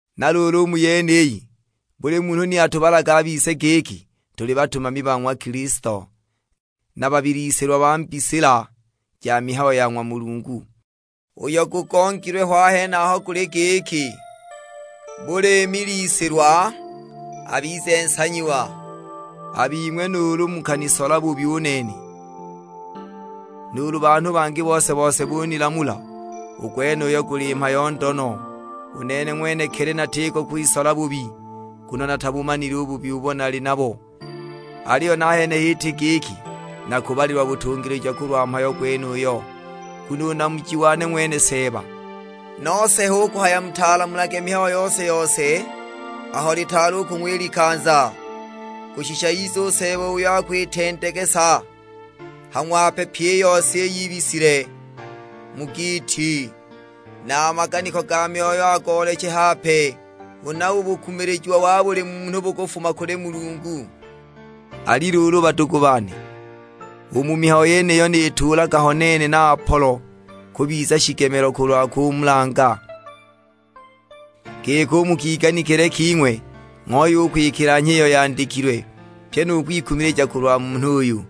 Na luulu u mu yeniyi, buli munhu ni atubalage a bise giki tuli batumami ba ng'wa Kilisto, na babilisilwa ba mbisila ja mihayo ya ng'wa Mulungu. Uyo gugongilwe ho a henaho guli giki, buli milisilwa abize nsanyiwa. A bing'we nuulu mukanisola bubi u nene, nuulu banhu bangi bose-bose bunilamula, u gwenuyo guli mhayo ndo no; u nene ng'wenekili natiko kwisola bubi. Nguno natabumanile u bubi ubo nali nabo; aliyo nahene h'iti giki nakubalilwa butungilija kulwa mhayo gwenuyo, nguno u namuji wane ng'wene Seeba. Nose hu kuhaya mutalamulage mihayo yose-yose aho litaali u kung'wa i likanza, kushisha ize u Seeba uyo akwitendegesa ha ng'wape pyi iyo yibisile mu giiti, na a maganiko ga myoyo agooleche hape; huna u bukumilijiwa wa buli munhu bukufuma kuli Mulungu. Ali luulu badugu bane, u mu mihayo yeniyo nituulaga ho nene na Apolo kubiza shigemelo kulwa kumulanga, giki u mu kiganikile king'we ng'ooye u kwikilanhya iyo yandikilwe, pyi nu kwikumilija kulwa munhu uyu,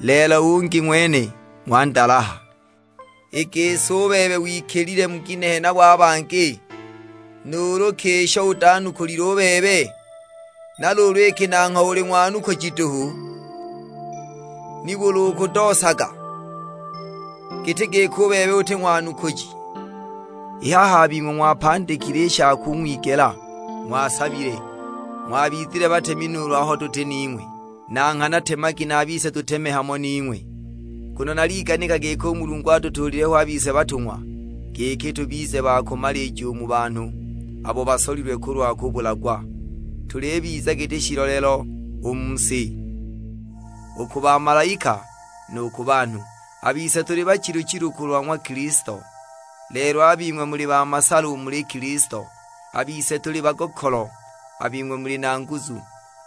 lelo u ungi ng'wene ng'wandalaha! I gisi u bebe wikilile mu ginehe nabo a bangi? Nuulu ki isho utanukulile u bebe? Na luulu iki nangho uli ng'wanukuji duhu, nibuli ukudoosaga, giti giki u bebe uti ng'wanukuji! I haha a bing'we ng'wapandikile i sha kung'wigela, ng'wasabile, ng'wabizile batemi nuulu aho tuti hamo ning'we; na nghana temagi na a bise tuteme hamo ning'we. Nguno naliganika giki u Mulungu atutuulile ho a bise batung'wa, giki tubize ba kumalija u mu banhu abo basolilwe kulwa kubulagwa. Tulibiza giti shiiloleelo u mu si: u ku bamalaika nu ku banhu. A bise tuli bachilu-chilu kulwa ng'wa Kilisto; lelo a bing'we muli na masala u muli Kilisto, a bise tuli bagokolo, a bing'we muli na nguzu;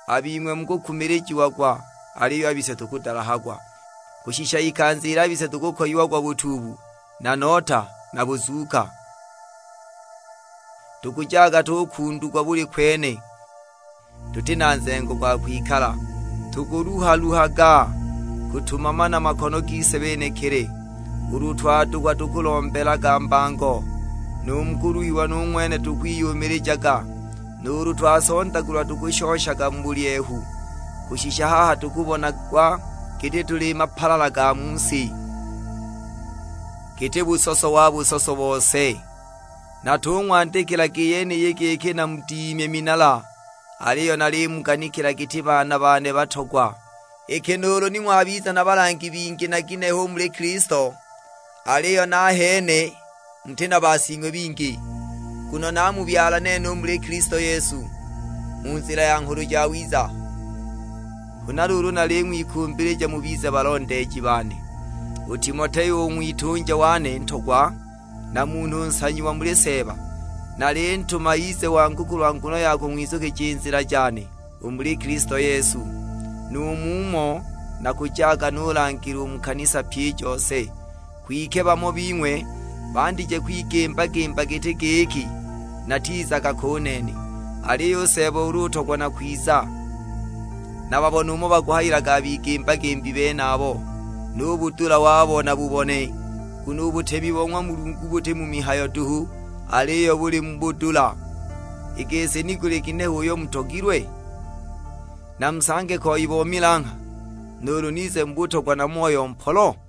a bing'we mukukumilijiagwa, aliyo a bise tukudalahagwa. Kushisha ikanza ili a bise tukukoyiagwa butuubu na nota na buzuuka; tukujaga tukundugwa buli kwene, tuti na nzengo gwa kwikala. Tukuluha-luhaga kutumama na makono gise benekili; ulu twadukwa tukulombelaga mbango, nu mu kuluhiwa nu ng'wene tukwiyumilijaga. Nuulu twasondagulwa tukushoshaga mu bulyehu; kushisha haha tukubonagwa giti tuli mapalala ga mu si; giti busoso wa busoso bose! Natung'wandikilaga i yeniyi giki namudimye minala, aliyo nalimuganikila giti baana bane batogwa. Iki nuulu ni ng'wabiza na balangi bingi na ginehe u muli Kilisto, aliyo nahene muti na basing'we bingi, nguno naamubyala nene u muli Kilisto Yesu, mu nzila ya Nghulu Jawiza. Huna luulu naling'wikumbilija mubize balondeeji bane. U Timoteo u ng'witunja wane ntogwa, na munhu nsanyiwa muli Seeba, nalintuma ize uko muli kulwa nguno ya kung'wizukija i nzila jane u muli Kilisto Yesu, nu mumo nakujaga nulangila u mu kanisa pyi i jose. Kwike bamo bing'we bandije kwigimba-gimba giti giki natizaga ko u nene! Aliyo u Seeba ulu utogwa nakwiza, nababone umo bakuhayilaga a bigimba-gimbi benabo; nu budula wabo nabubone. Nguno u butemi bo ng'wa Mulungu buti mu mihayo duhu, aliyo buli mu budula. I gisi ni guli ginehe uyo mugutogilwe? Namusange koi bo milangha, nuulu nize mu butogwa na moyo mpolo?